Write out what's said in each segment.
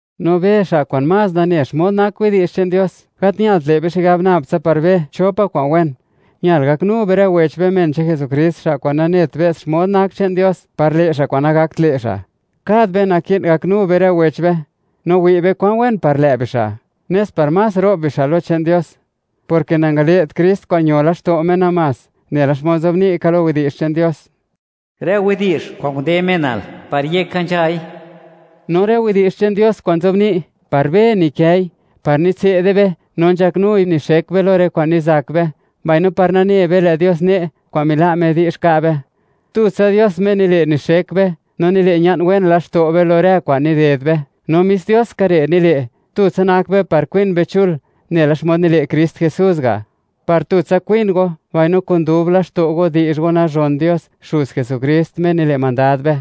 No be xa' kwa'n más nane xmod nak widi'zh che'n Dios, gat ñalt le' be xigab nab tsa par be cho pa' kwa'n wen; ñal gaknu be rë men che'n Jesukrist, xa' kwa'n nanet be's xmod nak che'n Dios, par le' xa' kwa'n nagakt le' xa'. Kad be naki'n gaknu be rë wech be, no wi' be kwan wen par lë' bixa', nes par más ro'b bixa' lo che'n Dios, porke nangale't Krist kwa'n ño laxto' Me namás. Nela xmod nzobni' ka lo Yech che'n Dios: “Rë widi'zh kwa'n nde menal, par yeka nzhai.” No rë widi'zh che'n Dios kwa'n nzobni', par be nikëi, par nitse'de be, no nzhaknui nixek be lo rë kwa'n nizak be, mbaino par nane be lë' Dios ne' kwa'n mila' Me di'zh ka' be. Tutsa Dios Me nile' nixek be no nile' ña'n wen laxto' be lo rë kwa'n nided be, no mis Dios ska re' nile', tutsa nak be par kwin be chul, nela xmod nile' Krist Jesús ga', par tutsa kwin go mbaino kun dub laxto' go, di'zh go nazhon Dios, Xuz Jesukrist, Me nile' mandad be.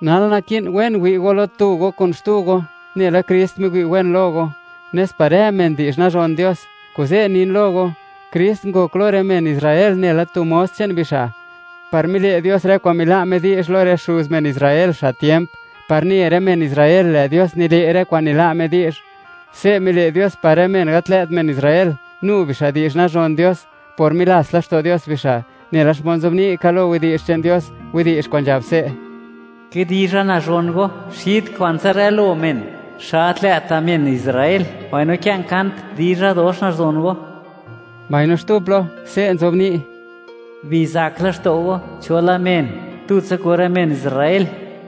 Nal, naki'n wen wi' go lo tu go kun xtu go, nela Krist miwi' wen lo go, nes par rë men di'zh nazhon Dios. Kuze' nin lo go, Krist ngok lo rë men Israel nela tu mos che'n bixa', par mile' Dios rë kwa'n mila' Me di'zh lo rë xuz men Israel, xa' tiemp, par ne rë men Israel, lë' Dios nile' rë kwa'n nila' Me di'zh. Se' mile' Dios par rë men gat lë't men Israel, nu bixa' di'zh nazhon Dios por milats laxto' Dios bixa', nela xmod nzobni' ka lo Yech che'n Dios, widi'zh kwa'n nzhab se': Kidizha nazhon Go xid kwantsa rë lo men, xa' gat lë'ta' men Israel, mbaino kë'n kant, dizha dox nazhon Go. Mbaino xtu plo, se' nzobni': Bizak laxto' go cho la men, tutsa kun rë men Israel.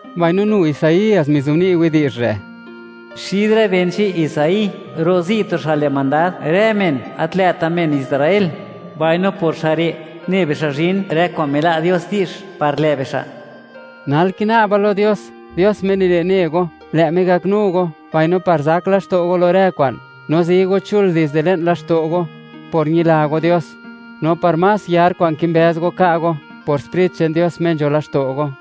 Mbaino nu Isaías mizobni' widi'zh re': Xid rë ben che'n Isaí rozi' tu xa' le' mandad rë men gat lë'ta' men Israel, mbaino por xa' re', ne bixa' zhin rë kwa'n mila' Dios di'zh par lë' bixa'. Nal kina'ba lo Dios, Dios Me nile' ne go, lë' Me gaknu go, mbaino par zak laxto' go lo rë kwa'n, no zi go chul dizde le'n laxto' go por ñila go Dios, no par más yar kwa'n kimbëz go ka' go, por Sprit che'n Dios, Me nzho laxto' go.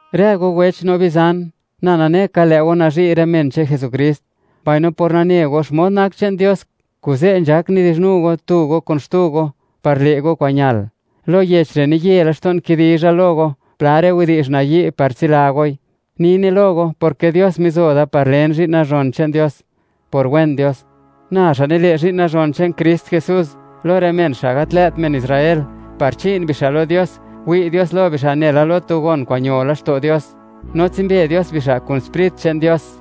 Rë go wech no bizan, na nane ka, lë' go nazhi' rë men che'n Jesukrist, mbaino por nane go xmod nak che'n Dios, kuze' nzhak nidi'zhnu go tu go kun xtu go par le' go kwa'n ñal. Lo yech re', niye laxto'n kidizha lo go pla rë widi'zh nayi' par tsila goi; nine lo go porke Dios mizo da par len zhi'n nazhon che'n Dios, por wen Dios. Na xa' nile zhi'n nazhon che'n Krist Jesús lo rë men xa' gat lë't men Israel, par chi'n bixa' lo Dios, wi' Dios lo bixa' nela lo tu gon kwa'n ño laxto' Dios, no tsimbe Dios bixa' kun Sprit che'n Dios.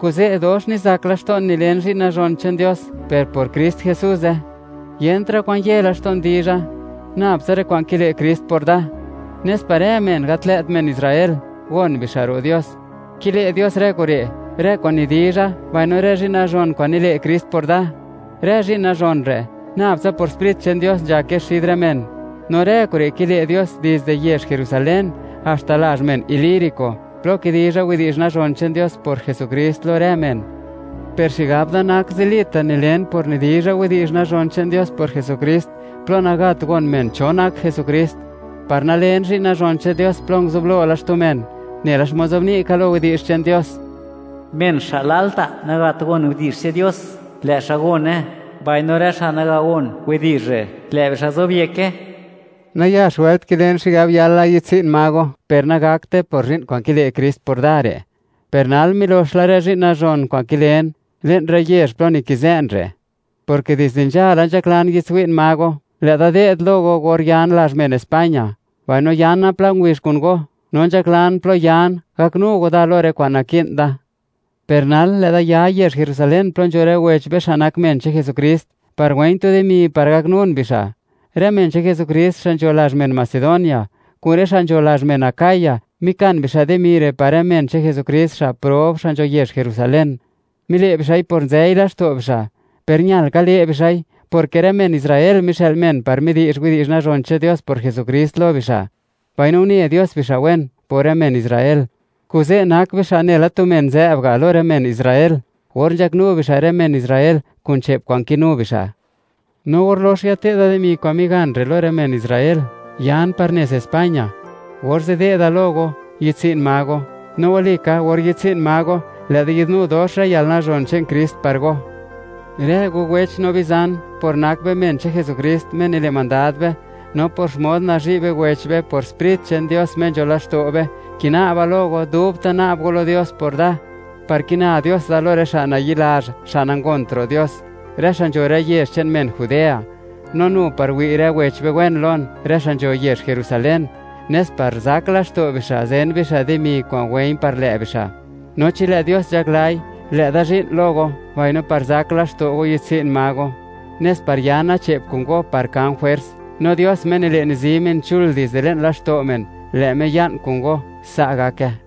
Kuze' dox nizak laxto'n nilen zhi'n nazhon che'n Dios, per por Krist Jesuze. Yentra' kwan ye laxto'n dizha, nab tsa rë kwa'n kile' Krist por da, nes par rë men gat lë't men Israel gon bixa' ro' Dios; kile' Dios rë kure', rë kwa'n nidizha, mbaino rë zhi'n nazhon kwa'n nile' Krist por da. Rë zhi'n nazhon re', nab tsa por Sprit che'n Dios nzhake xid rë men. No rë kure' kile' Dios, dizde yezh Jerusalén haxta lazh men Ilírico, plo kidizha widi'zh nazhon che'n Dios por Jesukrist lo rë men. Per xigab da nak zilita' nilen por nidizha widi'zh nazhon che'n Dios por Jesukrist plo nagat gon men cho nak Jesukrist, par nalen zhi'n nazhon che'n Dios plo nguzublo la xtu men. Nela xmod nzobni' ka lo Yech che'n Dios: Men xa' lalta' nagat gon widi'zh che'n Dios, lë' xa' gone; mbaino rë xa' naga gon widi'zh re', lë' bixa' zobyeke. Nayax wëlt kilen xigab yala yi'dtsi'n ma go, per nagakte por zhi'n kwa'n kile' Krist por da re'. Per nal milox la rë zhi'n nazhon kwa'n kilen, le'n rë yezh plo nikizë'n re', porke dizde nzhala nzhaklan yi'dtswi'n ma go. Lë'da de'd lo go or yan lazh men España, mbaino yana pla ngubizh kun go, no nzhaklan plo yan, gaknu go da lo rë kwa'n naki'n da. Per nal, lë'da ya yezh Jerusalén plo nzho rë wech be xa' nak men che'n Jesukrist, par wë̱i̱ñ tu dimi par gaknun bixa'. Rë men che'n Jesukrist xa' nzho lazh men Macedonia kun rë xa' nzho lazh men Acaya, mikan bixa' dimi re' par rë men che'n Jesukrist xa' prob, xa' nzho yezh Jerusalén. Mile' bixa'i por nzëi laxto' bixa', per ñal ka le' bixa'i, porke rë men Israel mixë'l men par midi'zh widi'zh nazhon che'n Dios por Jesukrist lo bixa', mbaino une Dios bixa' wen por rë men Israel; kuze' nak bixa' nela tu men nzë'b ga' lo rë men Israel, or nzhaknu bixa' rë men Israel kun che'p kwa'n kinu bixa'. No or lox yate'da dimi kwa'n migan re' lo rë men Israel, yan par nez España, orze' de'da lo go, yi'dtsi'n ma go. No wali ka, or yi'dtsi'n ma go, lë'da yi'dnu dox rë yalnazhon che'n Krist par go. Rë go wech no bizan, por nak be men che'n Jesukrist, Me nile' mandad be, no por xmod nazhi' be wech be por Sprit che'n Dios Me nzho laxto' be; kina'ba lo go, dubta' na'b go lo Dios por da, par kina Dios da lo rë xa' nayi'lazh, xa' nangont ro' Dios, rë xa' nzho rë yezh che'n men Judea; no nu par wi' rë wech be wen lon, rë xa' nzho yezh Jerusalén, nes par zak laxto' bixa' zen bixa' dimi kwa'n wë̱i̱ñ par lë' bixa'. No chi lë' Dios nzhaklai, lë'da zhi'n lo go, mbaino par zak laxto' go, yi'dtsi'n ma go, nes par yana che'p kun go par kan jwers. No Dios Me nile', nizi men chul dizde le'n laxto' men, lë' Me ya'n kun go. Sa' gake.